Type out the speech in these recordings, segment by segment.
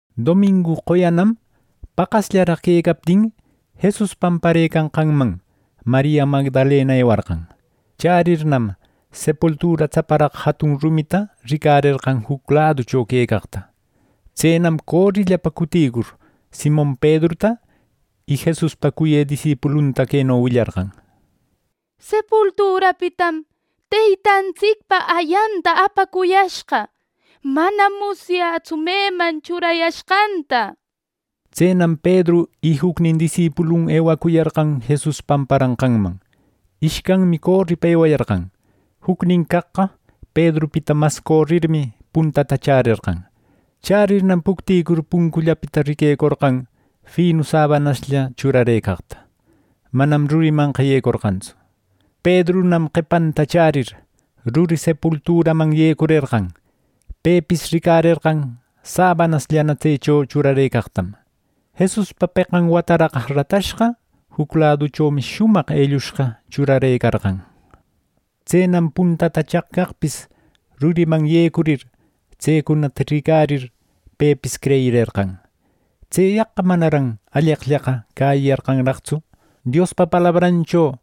Domingu qoyanam paqasllaraq quecaptin, Jesus pamparëcanqanman Maria Magdalena ewarqan. Chärirnam sepultura tsaparaq jatun rumita ricarerqan juc laducho quecaqta. Tsenam corillapa cuticur, Simon Pedruta y Jesuspa cuyë disipulunta queno willarqan: —Sepulturapitam Teytantsicpa ayanta apacuyashqa. Manam musyätsu meman churayashqanta —nir. Tsenam Pedru y jucnin disipulun ewacuyarqan Jesus pamparanqanman. Ishcanmi coripa ewayarqan. Jucnin caqqa Pedrupita mas corirmi, puntata chärerqan. Chärirnam pucticur puncullapita riquecorqan finu sabanaslla churarëcaqta. Manam rurimanqa yecorqantsu. Pedrunan qepanta chärir, ruri sepulturaman yecurerqan. Pepis ricarerqan sabanasllana tsecho churarëcaqtam. Jesuspa peqan wataraq ratashqa juc laduchomi shumaq ellushqa churarëcarqan. Tsenam puntata chaq caqpis ruriman yecurir, tsecunata ricarir pepis creyirerqan. Tseyaqqa manaran alleqllaqa cäyiyarqantsu Diospa palabrancho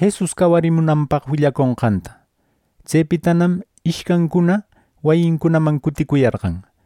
Jesus cawarimunanpaq willaconqanta. Tsepitanam ishcancuna wayincunaman cuticuyarqan.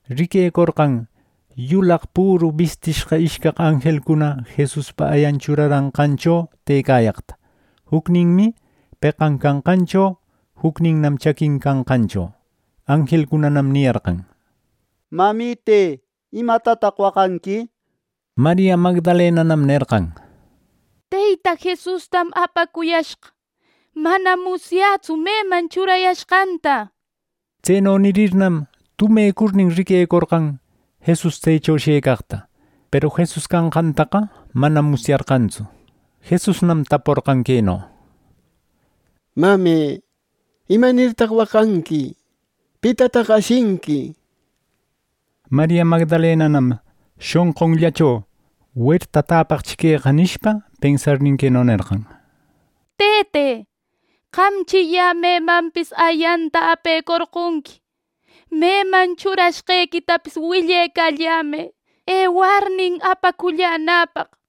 riquecorqan yulaq püru bistishqa ishcaq anjelcuna Jesuspa ayan churarashqancho tëcayaqta; jucninmi peqan canqancho, jucninnam chaquin canqancho. Anjelcunanam niyarqan: —Mamite ¿imatataq waqanqui? —nir. Maria Magdalenanam nerqan: —Teyta Jesustam apacuyashqa. Manam musyätsu meman churayashqanta —nir. Tseno nirirnam tumecurnin riquecorqan Jesus tsecho shëcaqta. Peru Jesus canqantaqa manam musyarqantsu. Jesusnam taporqan queno: —Mame ¿imanirtaq waqanqui? ¿Pitataq ashinqui? —nir. Maria Magdalenanam shonqunllacho “Werta täpaqchi queqa” nishpa pensarnin, queno nerqan: —Tëte, ¿qamchi yä memanpis ayanta apecorqonqui? Meman churashqequitapis willecallämë ewarnin apacullanäpaq —nir.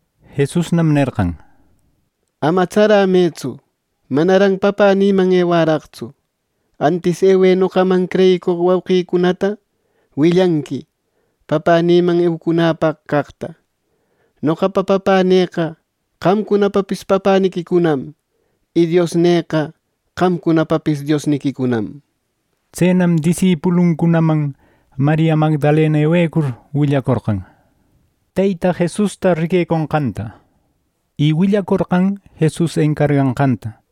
Jesusnam nerqan: —¡Ama tsaramëtsu! Manaran Papänïman ewäraqtsu. Antis ewë noqaman creyicoq wauqïcunata. Willanqui Papänïman eucunäpaq caqta; noqapa Papänïqa qamcunapapis Papäniquicunam, y Diosnïqa qamcunapapis Diosniquicunam —nir. Tsenam disipuluncunaman Maria Magdalena ewecur, willacorqan Teyta Jesusta riqueconqanta, y willacorqan Jesus encarganqanta.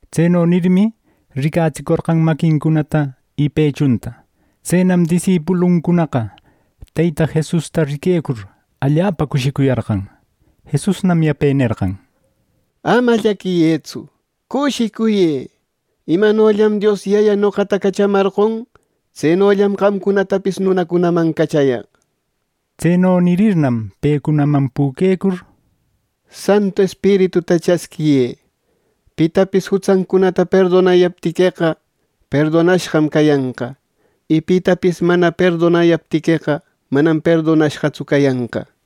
Tseno nirmi, ricatsicorqan maquincunata y pechunta. Tsenam disipuluncunaqa Teyta Jesusta riquecur, allapa cushicuyarqan. Jesusnam yape nerqan: —¡Ama llaquiyëtsu, cushicuyë! Imanollam Dios Yaya noqata cachamarqon; tsenollam qamcunatapis nunacunaman cachayaq. Tseno nirirnam pecunaman püquecur: —Santu Espirituta chasquiyë —nerqan. Pitapis jutsancunata perdonayaptiqueqa perdonashqam cayanqa, y pitapis mana perdonayaptiqueqa manam perdonashqatsu cayanqa —nir.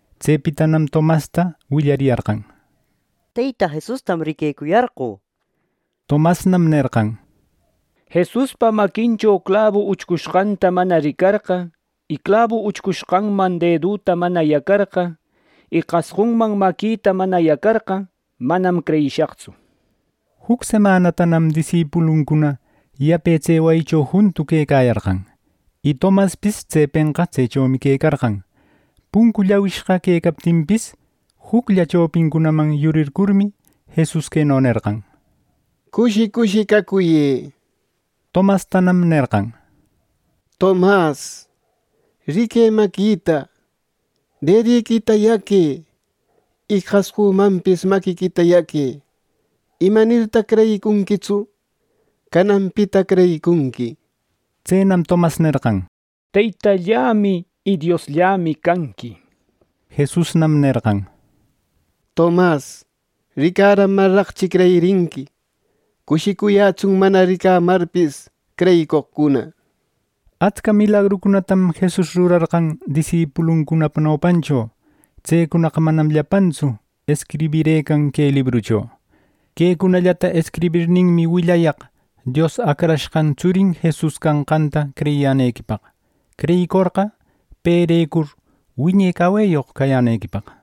Tsepitanam Tomasta willariyarqan: —Teyta Jesustam riquecuyarqö —nir. Tomasnam nerqan: —Jesuspa maquincho clabu uchcushqata mana ricarqa, y clabu uchcushqanman dedüta mana yacarqa, y qasqunman maquita mana yacarqa, manam creyishaqtsu —nir. Juc semanatanam disipuluncuna yape tse wayicho juntu quecayarqan. Y Tomaspis tsepenqa tsechomi quecarqan. Puncu llawishqa quecaptinpis, juclla chopincunaman yurircurmi, Jesus queno nerqan: —¡Cushi cushi cacuyë! —nir. Tomastanam nerqan: —Tomas, riquë maquita, dediquita yaque. Y qasqümanpis maquiquita yaque. ¿Imanirtaq creyicunquitsu? ¡Cananpita creyicunqui! —nir. Tsenam Tomas nerqan: —¡Teytallämi y Diosllämi canqui! —nir. Jesusnam nerqan: —Tomas, ¿ricaramarraqchi creyirinqui! Cushicuyätsun mana ricamarpis creyicoqcuna —nir. Atsca milagrucunatam Jesus rurarqan disipuluncunapa nopancho. Tsecunaqa manam llapantsu escriberqan que librucho. Quecunallata escribirninmi willayaq Dios Acrashqan tsurin Jesus canqanta creyiyänequipaq. Creyicorqa, perecur wiñe caweyoq cayänequipaq.